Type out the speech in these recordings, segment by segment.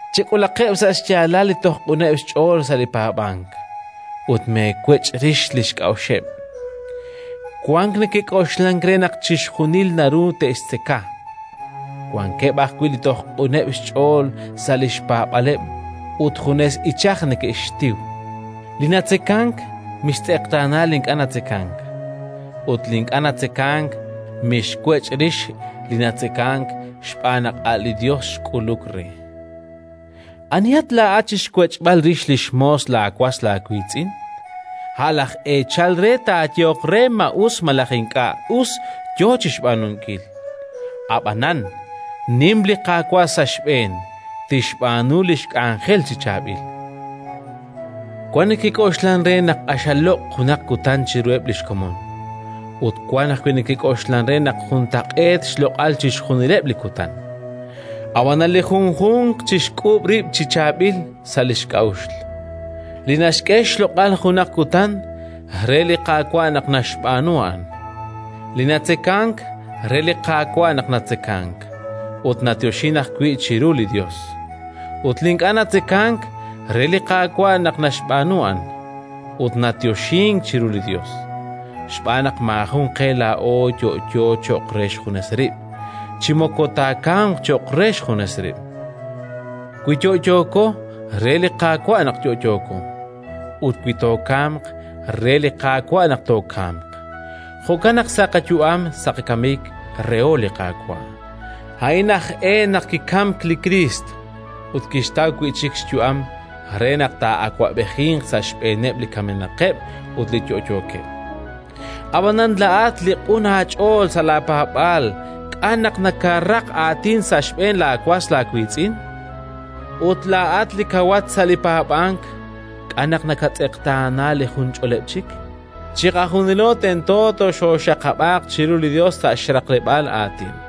Chek'ulaqeb' sa' xyaalal li toj q'uneb' xch'ool sa' li paab'ank ut meewech' rix li xk'a'uxeb'. Wank neke'k'oxlank re naq chixjunil naru te'xtzeka; wankeb' ajwi' li toj q'uneb' xch'ool sa' li xpaab'aaleb' ut junes ichaj neke'xtiw. Li natzekank, mixtz'eqtaana li ink'a' natzekank; ut li ink'a' natzekank, mixwech' rix li natzekank xb'aan naq a' li Yos xk'uluk re. Anihat laa'at chi xwech'b'al rix li xmoos laawas aawiitz'in? A' laj eechal re taayehoq re ma us malaj ink'a' us yo chi xb'aanunkil. Ab'anan, nim li Qaawa' sa' xb'een, tixb'aanu li xk'anjel chi chaab'il. Wank neke'k'oxlank re naq q'axal loq' junaq kutan chiruheb' li xkomon; ut wank ajwi' neke'k'oxlank re naq juntaq'eet xloq'al chixjunileb' li kutan. Ab'anan li junjunq chixk'uub' rib' chi chaab'il sa' li xk'a'uxl. Li naxk'e xloq'al junaq kutan, re li Qaawa' naq naxb'aanu a'an; li natzekank, re li Qaawa' naq natzekank, ut nayoxink ajwi' chiru li Yos; ut li ink'a' natzekank, re li Qaawa' naq naxb'aanu a'an, ut nayoxink chiru li Yos. Xb'aan naq maajun qe laa'o yo'yo cho'q re xjunes rib', chi moko taakamq cho'q re xjunes rib'. Wi yo'yooko, re li Qaawa' naq yo'yooko; ut wi tookamq, re li Qaawa' naq tookamq. Jo'kan naq sa' qayu'am sa' qakamik reho li Qaawa'. A'in aj e naq kikamk li Kriist ut kixtaw wi' chik xyu'am, re naq taa'awab'ejinq sa' xb'eeneb' li kamenaqeb' ut li yo'yookeb'. Ab'anan laa'at li q'un aach'ool sa' laapaab'aal k'a' naq nakaraq aatin sa' xb'een laawas aawiitz'in? Ut laa'at li kawat sa' li paab'ank k'a' naq nakatz'eqtaana li junch'oleb' chik? Chiqajunilo tento toxooxaqab'aaq chiru li Yos sa' xraqleb'aal aatin,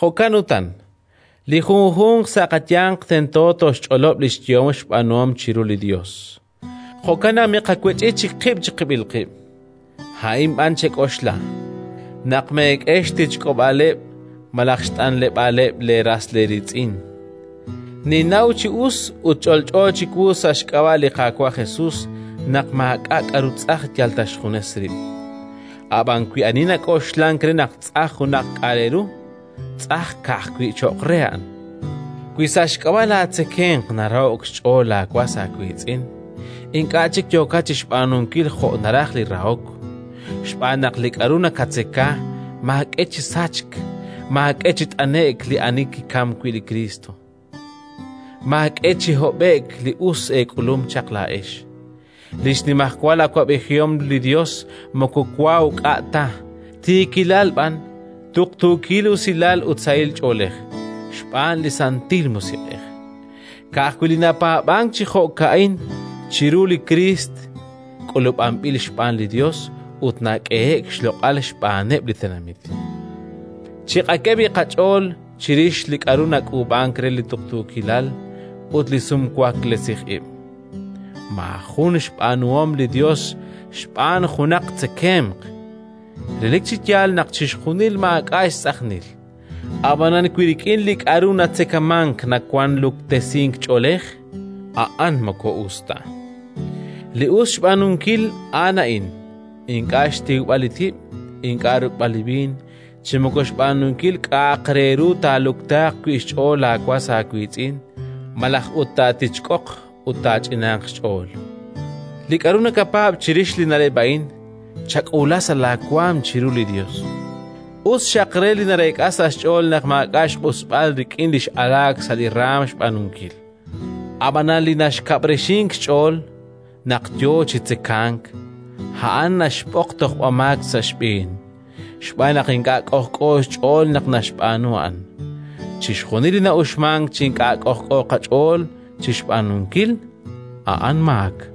Jo'kan utan, li junjunq sa' qayanq tento toxch'olob' li xyehom xb'aanuhom chiru li Yos. Jo'kan naq miqawech'i chik qib' chiqib'il qib'; a'in b'an chek'oxla: naq meek'e xtichk'ob'aaleb' malaj xt'anleb'aaleb' leeras eeriitz'in. Ninnaw chi us ut ch'olch'o chiwu sa' xk'ab'a' li Qaawa' Jesus naq maak'a' k'aru tz'aj yal ta xjunes rib'; ab'an wi ani nak'oxlank re naq tz'aj junaq k'a' re ru, tz'aj ka'ajwi' cho'q re a'an. Wi sa' xk'ab'a' laatzekemq naraho'k xch'ool laawas aawiitz'in, ink'a' chik yookat chi xb'aanunkil jo' naraj li rahok. Xb'aan li k'aru nakatzeka maak'e chi sachk, maak'e chi t'ane'k li ani kikamk wi' li Kriist. Maak'e chi hob'e'k li us eek'ulum chaq laa'ex. Li xnimajwal awab'ejihom li Yos moko wa uk'a' ta, tiikilal b'an, tuqtuukil usilal ut sahil ch'oolej xb'aan li Santil Musiq'ej. Ka'ajwi' li napaab'ank chi jo'ka'in chiru li Kriist, k'ulub'anb'il xb'aan li Yos ut nak'ehe'k xloq'al xb'aaneb' li tenamit. Chiqak'e b'i' qach'ool chirix li k'aru nak'uub'ank re li tuqtuukilal ut li sumwaklesij ib'. Maajuk' xb'aanuhom li Yos xb'aan junaq tzekemq. Relik chi yaal naq chixjunil maak'a' xtz'ajnil; ab'anan wi rik'in li k'aru natzekamank nawank luktesink ch'oolej, a'an moko us ta. Li us xb'aanunkil a'an a'in: ink'a' xtiwb'al li tib', ink'a' ruk'b'al li b'iin, chi moko xb'aanunkil k'a'aq re ru taaluktaaq wi' xch'ool laawas aawiitz'in, malaj ut taatichk'oq ut taach'inanq xch'ool. Li k'aru nakapaab' chirix li na'leb' a'in, chak'uula sa' laawaanm chiru li Yos. Us xaq re li nareek'a sa' xch'ool naq maak'a' xq'usb'al rik'in li x'alaak sa' li raanm xb'aanunkil! Ab'anan li naxka'b'rixink xch'ool naq yo chi tzekank, a'an naxb'oq tojb'amaak sa' xb'een, xb'aan naq ink'a' k'ojk'o xch'ool naq naxb'aanu a'an. Chixjunil li na'uxmank chi ink'a' k'ojk'o qach'ool chi xb'aanunkil, a'an maak.